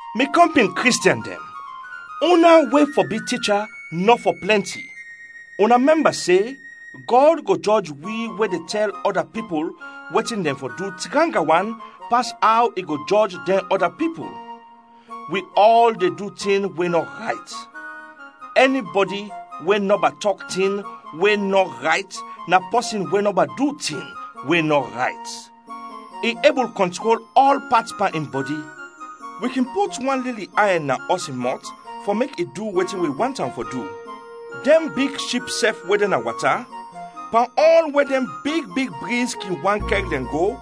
Mi kɔmpin Kristiɛn dɛn, una we fɔ bi ticha nɔ fɔ plɛnti. Una mɛmba se Gɔd go jɔj wi we de tɛl ɔda pipul wetin dɛn fɔ du tranga wan pas aw i go jɔj dɛn ɔda pipul. Wi ɔl de du tin we nɔ rayt. Ɛnibɔdi we nɔba tɔk tin we nɔ rayt na pɔsin we nɔba du tin we nɔ rayt. I ebul kɔntrol ɔl pat pan in bɔdi. Wi kin put wan lili ayɛn na ɔs in mɔt fɔ mek i du wetin wi want am fɔ du. Dɛn big ship sɛf we de na wata, pan ɔl we dɛn big big briz kin want kɛr dɛn go,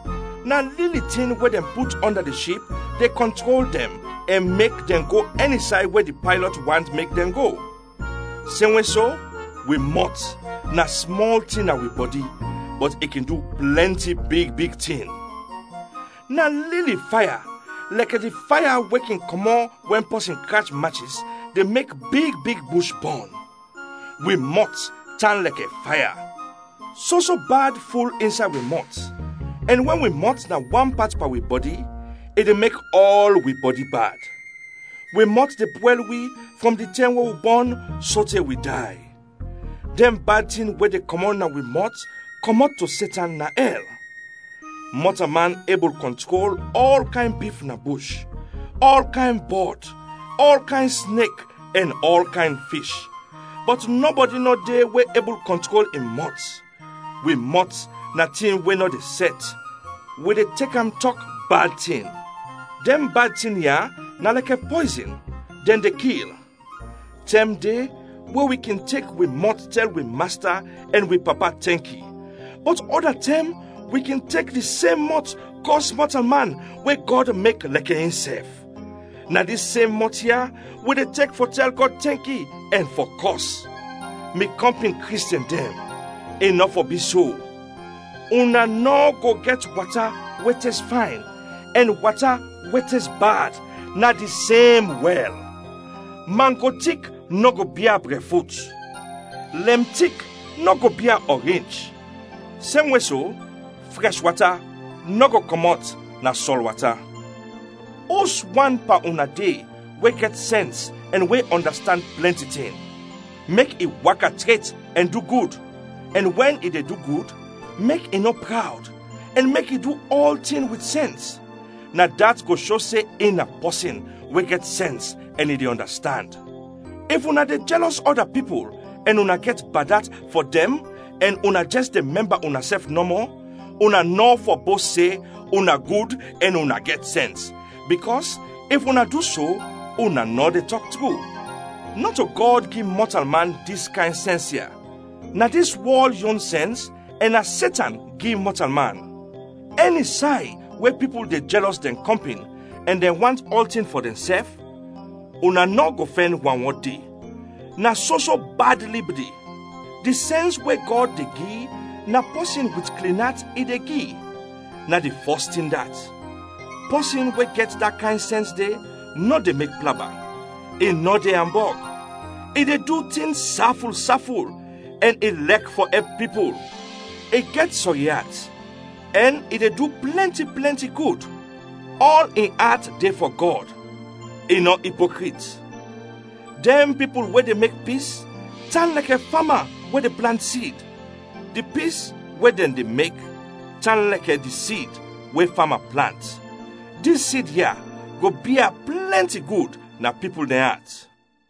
na lili tin we dɛn put ɔnda di ship de kɔntrol dɛn ɛn mek dɛn go ɛni say we di paylɔt want mek dɛn go. Semwe so, wi mɔt na smɔl tin na wi bɔdi, bɔt i kin du plɛnti big big tin. Na lili faya, lɛkɛ di faya we kin kɔmɔt wɛn pɔsin krach machis, de mek big big bush bɔn. Wi mɔt tan lɛkɛ faya. Soso bad ful insay wi mɔt ɛn we wi mɔt na wan pat pan wi bɔdi, i de mek ɔl wi bɔdi bad. Wi mɔt de pwɛl wi frɔm di tɛm we wi bɔn sote wi day. Dɛn bad tin we de kɔmɔt na wi mɔt kɔmɔt to Setan na ɛl. Mɔtalman ebul kɔntrol ɔl kayn bif na bush, ɔl kayn bɔd, ɔl kayn snek ɛn ɔl kayn fish, bɔt nɔbɔdi nɔ de we ebul kɔntrol in mɔt; wi mɔt na tin we nɔ de sɛt, wi de tek am tɔk bad tin. Dɛn bad tin ya na lɛkɛ pɔyzin, dɛn de kil. Tɛm de we wi kin tek wi mɔt tɛl wi Masta ɛn wi Papa tɛnki, bɔt ɔda tɛm wi kin tek di sem mɔt kɔs mɔtalman we Gɔd mek lɛkɛ insɛf. Na dis sem mɔt ya wi de tek fɔ tɛl Gɔd tɛnki ɛn fɔ kɔs. Mi kɔmpin Kristiɛn dɛn, i nɔ fɔ bi so. Una nɔ go gɛt wata we tes fayn ɛn wata we tes bad na di sem wɛl. Mangro tik nɔ go bia brɛfrut. Lɛm tik nɔ go bia ɔrinch. Semwe so, frɛsh wata nɔ go kɔmɔt na sɔl wata. Uswan pan una de we gɛt sɛns ɛn we ɔndastand plɛnti tin? Mek i waka tret ɛn du gud ɛn wɛn i de du gud, mek i nɔ prawd ɛn mek i du ɔltin wit sɛns; na dat go sho se in na pɔsin we gɛt sɛns ɛn i de ɔndastand. If una de jɛlɔs ɔda pipul ɛn una gɛt bad at fɔ dɛn ɛn una jɛs de mɛmba unasɛf nɔmɔ, una nɔ fɔ bost se una gud ɛn una gɛt sɛns, bikɔs if una du so, una nɔ de tɔk tru. Nɔto Gɔd gi mɔtalman dis kayn sɛns ya, na dis wɔl yon sɛns ɛn na Setan gi mɔtalman. Ɛni say we pipul de jɛlɔs dɛn kɔmpin ɛn dɛn want ɔltin fɔ dɛnsɛf, una nɔ go fɛn wanwɔd de; na soso bad lib de. Di sɛns we Gɔd de gi, na pɔsin wit klin at i de gi, na di fɔs tin dat. Pɔsin we gɛt da kayn sɛns de nɔ de mek plaba, i nɔ de ambɔg, i de du tin saful saful, ɛn i lɛk fɔ ɛp pipul; i gɛt sɔri at ɛn i de du plɛnti plɛnti gud; ɔl in at de fɔ Gɔd, i nɔ ipokrit. Dɛn pipul we de mek pis, tan lɛkɛ fama we de plant sid. Di pis we dɛn de mek tan lɛkɛ di sid we fama plant. Dis sid ya go bia plɛnti gud na pipul dɛn at.